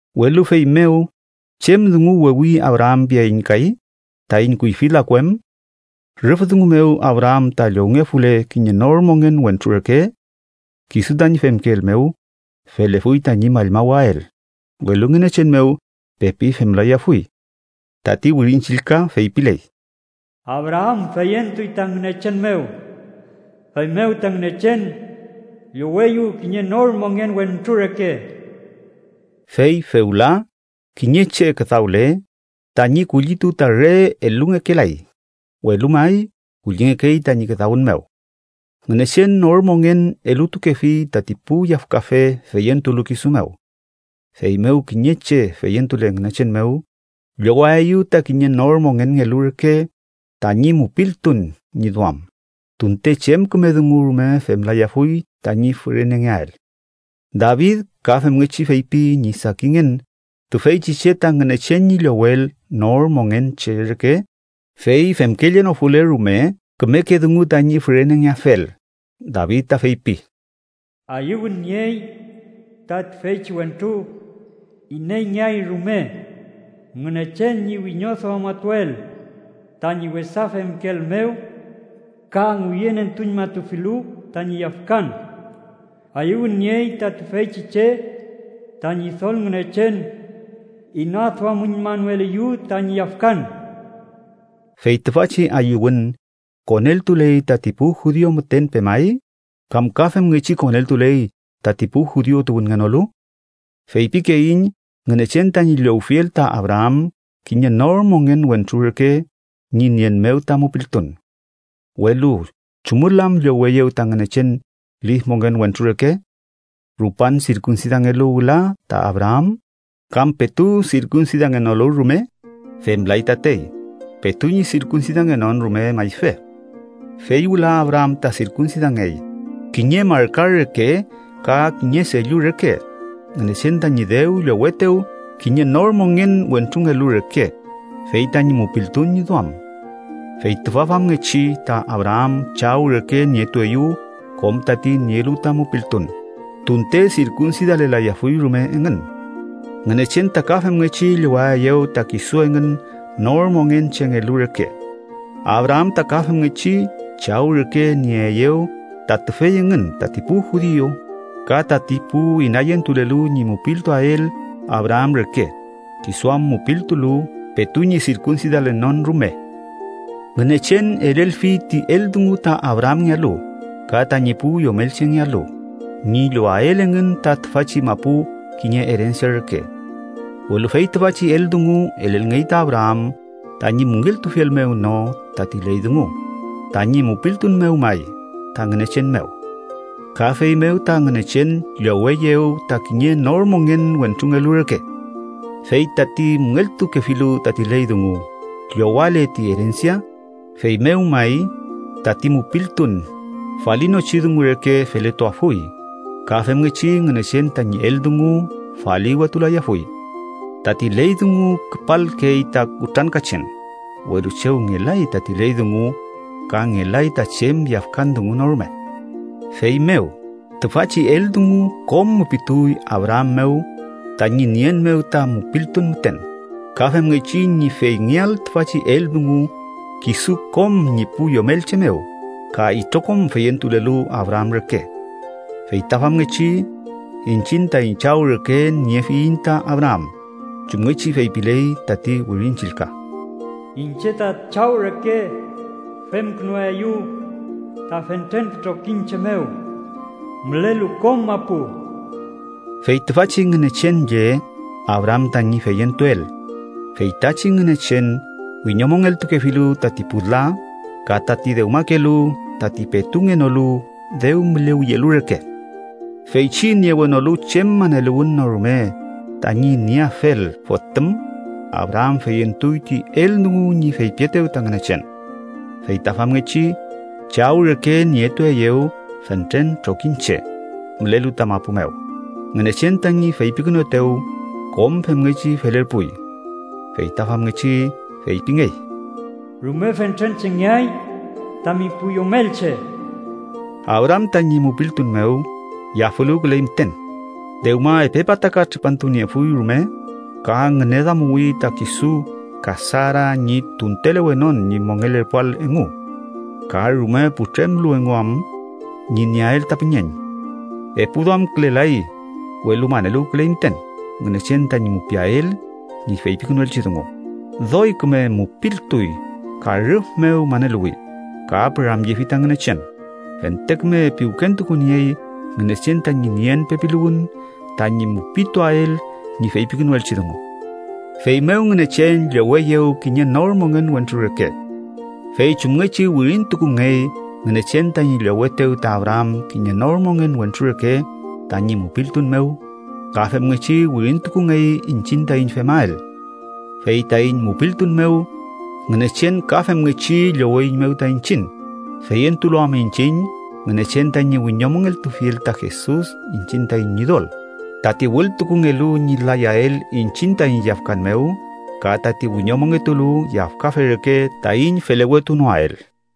Welu feymew, ¿chem dungu wewi Abraam piaiñ kay, taiñ kuyfi laku em? Rüf dungu mew Abraam ta llowngefule kiñe nor mongen wentru reke kisu tañi femkeel mew, felefuy tañi mallmawael, welu Ngünechen mew pepi femlayafuy. Tati Wirin Chillka feypiley: “Abraam feyentuy ta Ngünechen mew, feymew ta Ngünechen lloweyew kiñe nor mongen wentru reke.” Fey fewla, kiñe che küdawle, tañi kullitu ta re elungekelay, welu may kullingekey tañi küdawün mew. Ngünechen nor mongen elutukefi tati pu yafkafe feyentulu kisu mew. Feymew kiñe che feyentule Ngünechen mew, llowaeyew ta kiñe nor mongenngelu reke tañi mupiltun ñi duam, tunte chem küme dungu rume femlayafuy tañi fürenengeael. David ka femngechi feypi ñi sakinngen tüfeychi che ta Ngünechen ñi llowel nor mongen che reke, fey femkellenofule rume kümeke dungu tañi fürenengeafel. David ta feypi: “¡Ayüwün niey ta tüfeychi wentru ineyngeay rume Ngünechen ñi wiñoduamatuel tañi wesa femkeel mew ka ngüyünentuñmatufilu tañi yafkan! ¡Ayüwün niey ta tüfeychi che ta Ñidol Ngünechen inaduamüñmanoeliyew tañi yafkan!” ¿Fey tüfachi ayüwün koneltuley tati pu judiu müten pemay, kam ka femngechi koneltuley tati pu judiu tuwünngenolu? Feypikeiñ Ngünechen tañi llowfiel ta Abraam kiñe nor mongen wentru reke ñi nien mew ta mupiltun. Welu ¿chumül am lloweyew ta Ngünechen lif mongen wentru reke? ¿Rupan sirkunsidangelu wüla ta Abraam, kam petu sirkunsidangenolu rume? Femlay tatey, petu ñi sirkunsidangenon rume mayfe. Fey wüla Abraam ta sirkunsidangey, kiñe marka reke ka kiñe sellu reke Ngünechen tañi dew llowetew kiñe nor mongen wentrungelu reke, fey tañi mupiltun ñi duam. Fey tüfa famngechi, ta Abraam chaw reke nietueyew kom tati nielu ta mupiltun, tunte sirkunsidalelayafuy rume engün. Ngünechen ta ka femngechi llowaeyew ta kisu engün nor mongen chengelu reke. Abraam ta ka femngechi chaw reke nieeyew ta tüfey engün tati pu judiu ka tati pu inayentulelu ñi mupiltuael Abraam reke, kisu am mupiltulu petu ñi sirkunsidalenon rume. Ngünechen elelfi ti eldungu ta Abraamngealu ka tañi pu yomelchengealu ñi llowael engün ta tüfachi mapu kiñe erensia reke. Welu fey tüfachi eldungu elelngey ta Abraam tañi müngeltufiel mew no tati ley dungu, tañi mupiltun mew may ta Ngünechen mew. Ka feymew ta Ngünechen lloweyew ta kiñe nor mongen wentrungelu reke. Fey tati müngeltukefilu tati ley dungu llowale ti erensia, feymew may tati mupiltun falinochi dungu reke feletuafuy ka femngechi Ngünechen tañi eldungu faliwetulayafuy. Tati ley dungu küpalkey ta kutrankachen, welu chew ngelay tati ley dungu, ka ngelay ta chem yafkan dungu no rume. Feymew, tüfachi eldungu kom mupituy Abraam mew tañi nien mew ta mupiltun müten, ka femngechi ñi feyngeael tüfachi eldungu kisu kom ñi pu yomelche mew ka itrokom feyentulelu Abraam reke. Fey ta famngechi, iñchiñ taiñ chaw reke niefiyiñ ta Abraam, chumngechi feypiley tati Wirin Chillka: “Iñche ta chaw reke femkünuaeyu ta fentren pu trokiñche mew mülelu kom mapu.” Fey tüfachi Ngünechen lle Abraam tañi feyentuel, fey tachi Ngünechen wiñomongeltukefilu tati pu la, ka tati dewmakelu tati petu ngenolu dew mülewiyelu reke. Feychi niewenolu chem maneluwün no rume tañi nieafel fotüm, Abraam feyentuy ti eldungu ñi feypietew ta Ngünechen. Fey ta famngechi “chaw reke nietueyew fentren trokiñche” mülelu ta mapu mew, Ngünechen tañi feypikünuetew kom femngechi felerpuy. Feyta famngechi feypingey “rume fentren chengeay tami pu yomelche.” Abraam tañi mupiltun mew yafüluwküley müten, dewma epe pataka tripantu niefuy rume ka ngüneduamuwi ta kisu ka Sara ñi tuntelewenon ñi mongelerpuael engu. Ka rume putremlu engu am ñi nieael ta püñeñ. Epu duamkülelay, welu maneluwküley müten Ngünechen tañi mupiael ñi feypikünuelchi dungu, doy küme mupiltuy ka rüf mew maneluwi, ka püramyefi ta Ngünechen, fente küme piwkentukuniey Ngünechen tañi nien pepiluwün tañi mupituael ñi feypikünukeelchi dungu. Feymew Ngünechen lloweyew kiñe nor mongen wentru reke. Fey chumngechi wirintukungey Ngünechen tañi llowetew ta Abraam kiñe nor mongen wentru reke tañi mupiltun mew, ka femngechi wirintukungey iñchiñ taiñ femael. Fey taiñ mupiltun mew, Ngünechen ka femngechi lloweiñmew ta iñchiñ, feyentulu am iñchiñ Ngünechen tañi wiñomongeltufiel ta Jesus iñchiñ taiñ Ñidol, tati wültukungelu ñi layael iñchiñ taiñ yafkan mew ka tati wiñomongetulu yafkafe reke taiñ felewetunoael.